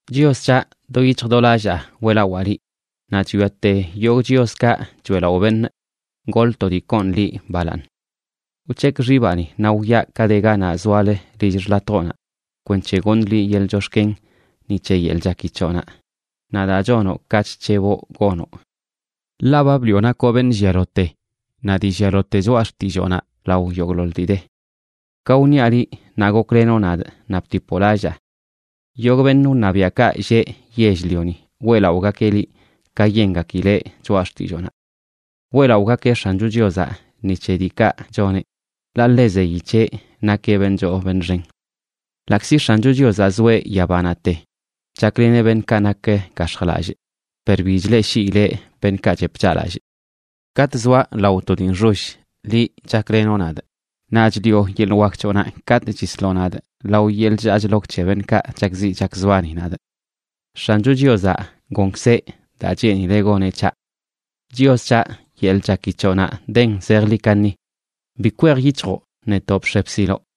Chios c̱haꞌ, do yic̱hj do lallaa weꞌlawaa liꞌ, naꞌ chwiate yogꞌ chioskaꞌ choeꞌlaꞌo beṉꞌ, goḻꞌ to dii koon liꞌ balaaṉ. Wc̱hekꞌ xibaꞌni naꞌ wwiaꞌ ka de ganaꞌ zoalə lill xḻatjoꞌnaꞌ, kwenc̱he goṉꞌ liꞌ yeḻꞌ chox̱ken ni c̱he yeḻꞌ chaki c̱hoꞌnaꞌ naꞌ daa chonoꞌ ka chc̱heboꞌ gonoꞌ. Ḻaꞌ ba bliꞌo nakoꞌ beṉꞌ llialote naꞌ dii llialote choꞌa xtilloonaꞌ lao yogꞌḻoḻ dii de. Ka wṉiaꞌ liꞌ, naꞌ goklenoꞌ nadꞌ, naꞌ bitipoꞌ lallaa. Yogꞌ beṉꞌ wṉabiaꞌkaꞌ lleꞌ yell-lioni weꞌlaꞌogakeꞌ liꞌ ka yengakileꞌ choꞌa xtilloonaꞌ. Weꞌlaꞌogakeꞌ X̱ancho Chiozaꞌ ni c̱he diikaꞌ choneꞌ, ḻaꞌ ḻe zeyi c̱heꞌ nakeꞌ beṉꞌ choo beṉꞌ xen. Ḻaꞌkzi X̱ancho Chiozaꞌ zoeꞌ yabanaꞌte chakleneꞌ beṉꞌkaꞌ nak gax̱jlallꞌ, per bi chleꞌshiileꞌ beṉꞌkaꞌ chep chaꞌlallꞌ. Katꞌ zoaꞌ lao to dii nxoll, liꞌ chaklenoꞌ nadꞌ; naꞌ chliꞌo yeḻꞌ wak c̱hoꞌnaꞌ katꞌ chisloꞌ nadꞌ lao yeḻꞌ chllaa chlok c̱he beṉꞌkaꞌ chakziꞌ chakzbani nadꞌ. X̱ancho Chiozaꞌ gonkzeꞌ daa cheenileꞌ goneꞌ c̱haꞌ. Chios c̱haꞌ, yeḻꞌ chaki c̱hoꞌnaꞌ den zejḻi kaṉi; bi kwej yic̱hjoꞌ netoꞌ bx̱e bsiloꞌ.